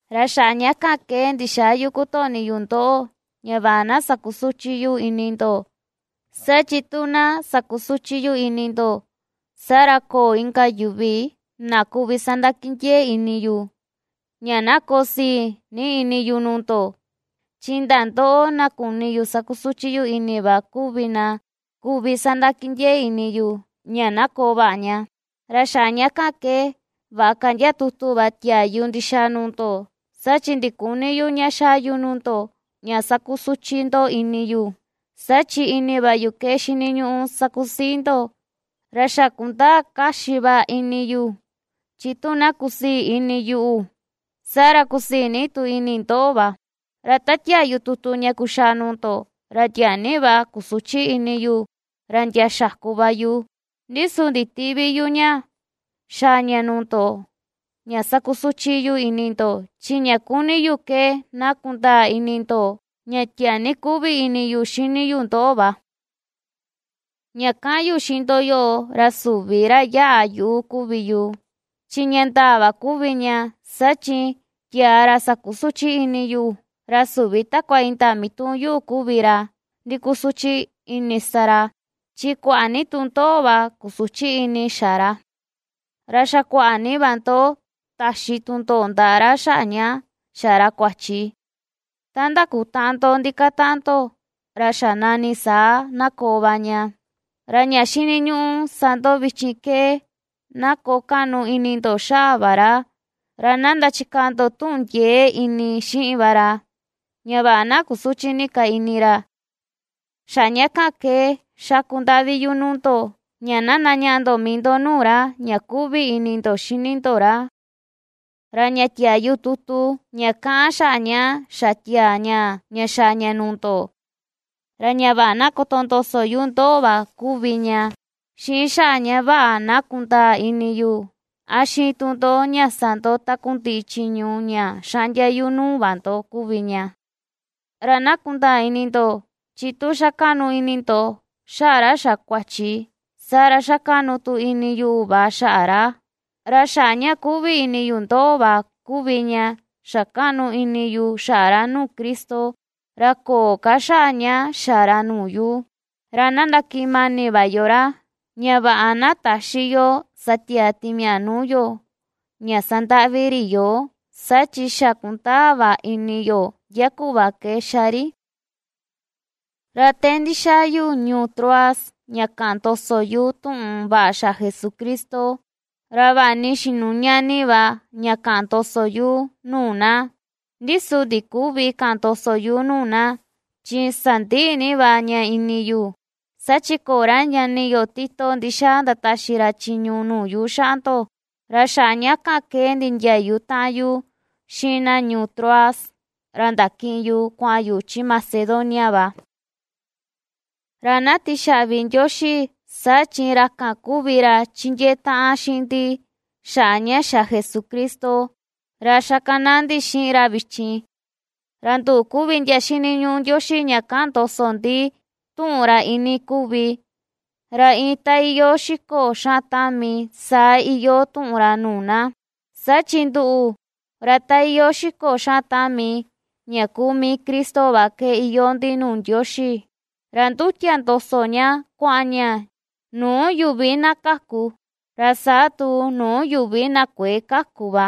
Ra xaꞌa ña kan ke ndixäa yu kutoꞌni yu ndoꞌo, ña vaꞌa na sakusüchi yu ini ndo. Saa chi tu na sakusuchi yu ini ndo, saa ra köo inka yuvi na kuvi sandakindiee ini yu, ña na koo sii ni ini yu nuu ndo. Chi indaa ndoꞌo na kuni yu sakusuchi yu ini va kuvi na kuvi sandakindiee ini yu ña na koo vaꞌa ña. Ra xaꞌa ña kan ke vaꞌa ka ndia tutu va tiaa yu ndixaa nuu ndo, saa chi ndiküni yu ña xaa yu nuu ndo ña sakusuchi ndo ini yu, saa chi ini va yu ke xiniñuꞌu sakusii ndo. Ra xa kundaa kaxi va ini yu chi tu na kusii ini yuꞌu, saa ra kusii ni tu ini ndoꞌo va. Ra ta tia̱à yu tutu ña kuxaa nuu ndo, ra tiaa ni va kusuchi ini yu, ra ndia xaku va yu; ndi su nditïꞌvi yu ña xaa ña nuu ndo ña sakusuchi yu ini ndo, chi ña ^kuni yu ke na kundaa ini ndo ña tiaa ni kuꞌvi ini yu xini yu ndoꞌo va. Ña kaꞌan yu xiꞌin ndo yoꞌo, ra süvi ra yaꞌa yuꞌu kuvi yu chi ña ndaa va kuvi ña, saa chi tiaa ra sakusuchi ini yu, ra süvi takua indaa mituꞌun yuꞌu kuvi ra ndikusuchi ini sa ra, chi kuaꞌa ni tu ndoꞌo va kusuchi ini xa ra. Ra xa kuaꞌa ni va ndo taxi tundoꞌo ndaꞌa ra xaꞌa ña xa ra kuachi ta ndakutaꞌan ndo ndikataꞌan ndo, ra xa nani saa na koo va ña. Ra ña xiniñuꞌu sa ndo vichin ke, na koo kaꞌnu ini ndo xaꞌa va ra, ra na ndachikaa ndo tuꞌun ndiee ini xiꞌin va ra, ña vaꞌa na kusüchi ni ka ini ra. Xaꞌa ña kan ke xaku ndaꞌvi yu nuu ndo, ña na ndañaꞌa ndo mii ndo nuu ra, ña kuꞌvi ini ndo xini ndo ra. Ra ña tiaa yu tutu, ña kaꞌan xaꞌa ña xa tiaa ñaa, ña xaa ña nuu ndo, ra ña vaꞌa na kotondoso yu ndoꞌo va kuvi ña, xiꞌin xaꞌa ña vaꞌa na kundaa ini yu a xiin tu ndo ña sa ndo takundiꞌi chiñu ña xaꞌndia yu nuu va ndo kuvi ña. Ra na kundaa ini ndo, chi tu ^xa kaꞌnu ini ndo xaꞌa ra xa kuachi, saa ra xa ^kaꞌnu tu ini yuꞌu va xaꞌa ra, ra xaꞌa ña kuꞌvi ini yu ndoꞌo va kuvi ña xa kaꞌnu ini yu xaꞌa ra nuu Cristo, ra köo ka xaꞌa ña xa ra nuu yu. Ra na ndakiꞌin mani va yo ra, ña vaꞌa na täxi yo ña sa tiaa timiaꞌa nuu yo ña sandaꞌvi ri yoo; saa chi xa kundaa va ini yo ndia kuꞌva ke xa ri. Ra te ndixaa yu ñuu Troas ña kaꞌan ndoso yu tuꞌun vaꞌa xaꞌa Jesucristo, ra vaꞌa ni xinuña ni va ña kaꞌan ndoso yu nuu na. Ndi su ndiküvi kaꞌan ndoso yu nuu na, chi sandiꞌi ni va ña ini yu, saa chi köo ra ñani yo Tito ndixaa ndataxi ra chiñu nuu yu xaꞌa ndo, ra xaꞌa ña kan ke nindiayu taꞌan yu xiꞌin na ñuu Troas, ra ndakiꞌin yu kuaꞌan yu chi Macedonia va. Ra na tixaꞌvi Ndioxi, saa chi ra kan kuvi ra ^chindiee taꞌan xiꞌin ndi, xaꞌa ña xa Jesucristo, ra ^xakanaa ndi xiꞌin ra vichin, ra nduꞌu kuvi ndia ^xiniñuꞌu Ndioxi ña ^kaꞌan ndoso ndi tuꞌun ra ini kuvi, ra iin ta iyoo xiko xaꞌan tami saa iyoo tuꞌun ra nuu na. Saa chi nduꞌu, ra ta iyoo xiko xaꞌan tami ña kuu mii Cristo va ke iyoo ndi nuu Ndioxi, ra ndutia ndoso ña kuaꞌan ña nuu yuvi na kaku, ra saa tu nuu yuvi na kuëe kaku va.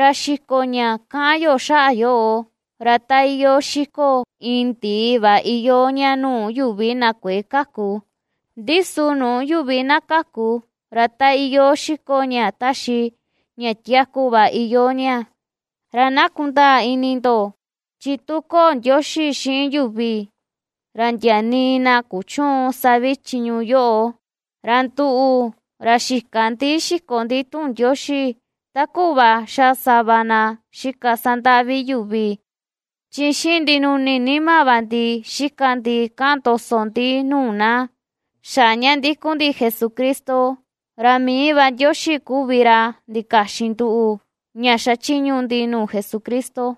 Ra xiko ña kaꞌan yo xaꞌa yoꞌo, ra ta iyoo xiko iin ndii va iyoo ña nuu yuvi na kuëe kaku, ndi su nuu yuvi na kaku, ra ta iyoo xiko ña taxi ña tiaku va iyoo ña. Ra na kundaa ini ndo, chi tu köo Ndioxi xiꞌin yuvi, ra ndia nii na kuchüun sa vi chiñu yoꞌo. Ra nduꞌu, ra xïka ndi xiko ndi tuꞌun Ndioxi, ta kuꞌva xa sava na xika sandaꞌvi yuvi, chi xiꞌin ndinuni nima va ndi xika ndi kaꞌan ndoso ndi nuu na, xaꞌa ña ndikun ndi Jesucristo, ra mii va Ndioxi kuvi ra ndikaxin nduꞌu ña ^xachiñu ndi nuu Jesucristo.